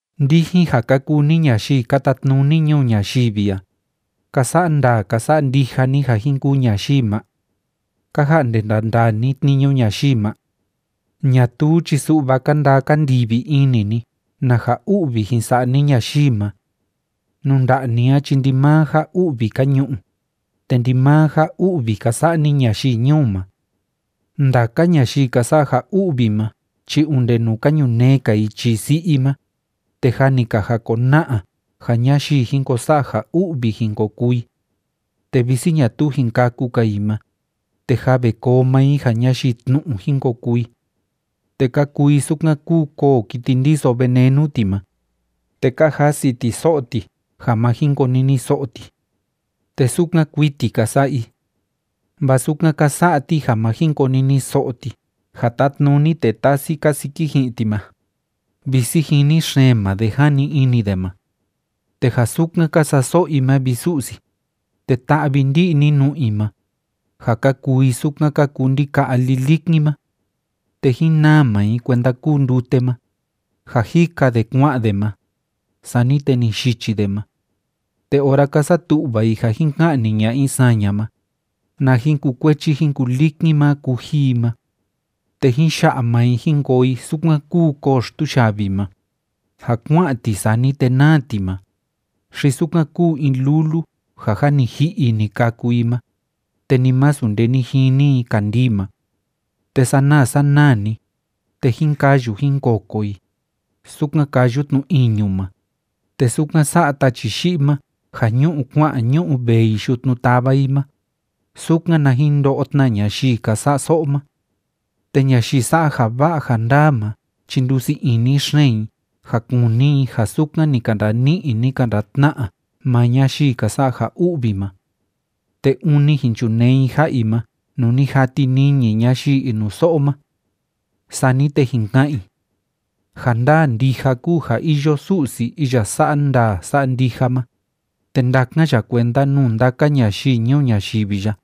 Ndijin ja ka kuu ni ñayii ka tatnuni ñuu ñayivi a, ¿ka sa'a ndaa ka sa'a ndija ni ja jin kuu ñayii ma? ¿Ka ja'nde ndandaa ni tniñu ñayii ma? Ñatuu chi su'va ka ndaa ka ndivi ini ni na ja u'vi jin sa'a ni ñayii ma. Nuu nda'a ni a chi ndimaa ja u'vi ka ñu'u, te ndimaa ja u'vi ka sa'a ni ñayii ñuu ma. Ndaka ñayii ka sa'a ja u'vi ma chi onde nuu ka ñunee‑ka i chii si'i i ma, te jâ ni ka jakona'a ja ñayii jin ko sa'a ja u'vi jin ko kuu i. Te visi ñatuu jin kâku‑ka i ma, te jâ ve koo maa i ja ñayii tnu'u jin ko kuu i. Te ka kuu i sukan kúu koo kiti ndiso venenu ti ma, te ka jasi ti so'o ti ja ma jin koniniso'o ti. Te sukan kuiti ka sa'a i. Vaa sukan ka sa'a ti ja ma jin koniniso'o ti ja tátnuni tee tasi kasiki ji'in ti ma, visi jini xeen maa de, jani ini de ma. Te ja sukan ka sa'a so'o i ma, vi Su'si, te ta'vi ndi'i ni nu'u i ma, ja ka kuu i sukan ka kuu ndika'a lilikin ma. Te jín naa maa i kuenda kúu ndute ma, ja jika de kua'an de ma, sani te ni yichi de ma. Te ora ka satu'va i ja jin ka'ni ña'a i saña ma, na jín kukuechi jín kulikin maa kuji i ma. Te jín ya'a maa i jín koo i sukan kúu koo xtuyavi ma, ja kua'an ti, sani te naa ti ma, xi sukan kúu in lulu ja jâ ni ji'i i ni kâku i ma, te ni masu nde ni jini i kandii ma. Te sanaa sanaa‑ni, te jín kayu jín koko i, sukan káyu tnu iñu ma, te sukan sa'a tachi yi'i ma ja ñú'u kua'an ñú'u vee i yutnu táva i ma, sukan na jin ndo'o tna ñayii ka sa'a so'o ma. Te ñayii sa'a ja va'a ja ndaa ma chi ndusii ini xeen i ja kuni i ja sukan ni ka ndani'i, ni ka ndatna'a maa ñayii ka sa'a ja u'vi ma. Te ûni jin chunee i ja'a i ma nuu ni jati niñi ñayii inuso'o ma. Sani te jin ka'an i: “Ja ndaa ndija kúu ja iyo Su'si iya sa'a ndaa sa'a ndija ma, te ndákan ya kuenda nuu ndaka ñayii ñuu ñayivi ya.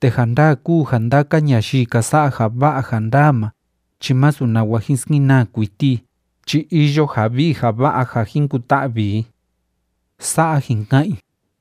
Te ja ndaa kúu ja ndaka ñayii ka sa'a ja va'a ja ndaa ma chi masu nawa jin skenaa kuiti i chi iyo ja vii ja va'a ja jin kuta'vi i.” Sa'a jin ka'an i.